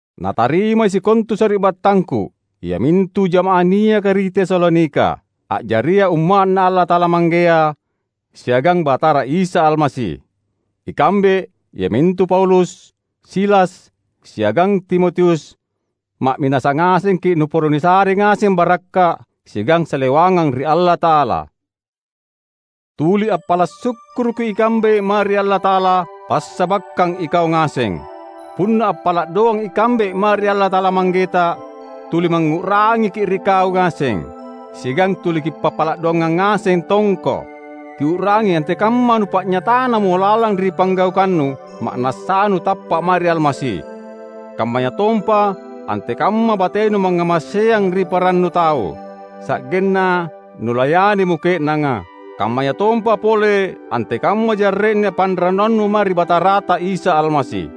Natarimai sikontu sari’battangku, iamintu jama’ah niaka ri Tesalonika, a’jaria Umma’Na Allata’ala Manggea siagang Batara Isa Almasi: Ikambe, iamintu Paulus, Silas, siagang Timotius, ma’minasa ngasengki’ nuporo nisare ngaseng barakka’ siagang salewangang ri Allata’ala. Tuli appala’ sukkuruki ikambe mae ri Allata’ala passabakkang ikau ngaseng. Punna appala’ doang ikambe mae ri Allata’ala Manggeta tuli mangngu’rangiki’ ri kau ngaseng, siagang tuli kipappala’ doangang ngaseng tongko. Kiu’rangi antekamma nupa’nyatanamo lalang ri panggaukannu, ma’nassanu tappa’ mae ri Almasi; kammayatompa antekamma batenu mangngamaseang ri parannu tau, sa’genna nulayanimo ke’nanga; kammayatompa pole antekamma jarre’na panrannuannu mae ri Batarata Isa Almasi.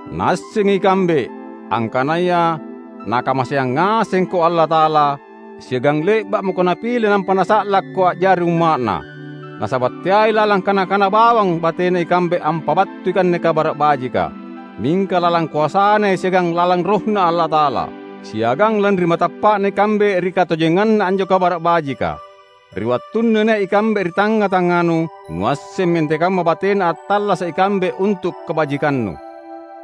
Naassengi ikambe, angkanaya Nakamaseang ngasengko Allata’ala, siagang le’ba’ mako Napile nampa Nasa’lakko a’jari umma’Na. Nasaba’ teai lalang kana-kana bawang batena ikambe ampabattui anne Kabara’ Bajika, mingka lalang koasaNai siagang lalang RohNa Allata’ala, siagang lanri matappa’na ikambe ri katojenganna anjo Kabara’ Bajika. Ri wattunna nia’ ikambe ri tangnga-tangnganu, nuassemmi antekamma batena attallasa’ ikambe untu’ kabajikannu.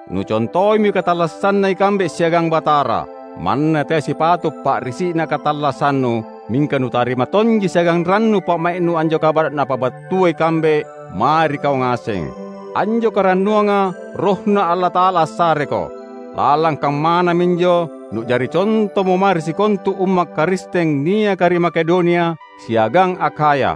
Nucontoimi katallassanna ikambe siagang Batara. Manna teai sipato’ pa’risi’na katallassannu, mingka nutarima tonji siagang rannu pa’mai’nu anjo kabara’ napabattua ikambe mae ri kau ngaseng. Anjo karannuanga RohNa Allata’ala assareko. Lalang kammana minjo nu’jari contomo mae ri sikontu Umma’ Karisteng niaka ri Makedonia siagang Akhaya.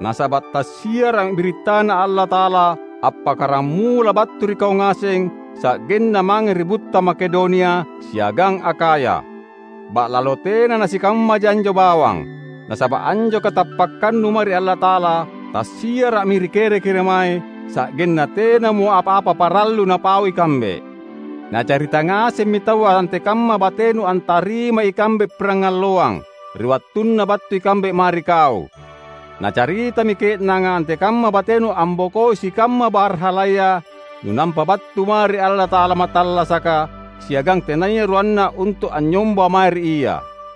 Nasaba’ tassiara’mi birittaNa Allata’ala appakkaramula battu ri kau ngaseng sa’genna mange ri butta Makedonia siagang Akhaya. Ba’lalo tena nasikammaja anjo bawang; nasaba’ anjo katappakkannu mae ri Allata’ala tassiara’mi ri kere-keremae, sa’genna tenamo apa-apa parallu napau ikambe. Nacarita ngasemmi taua antekamma batenu antarimai ikambe pirangalloang, ri wattunna battu ikambe mae ri kau. Nacaritami ke’nanga antekamma batenu ambokoi sikamma barhalaya nunampa battu mae ri Allata’ala mattallasaka siagang tenaya ruanna untu’ anynyomba mae ri Ia.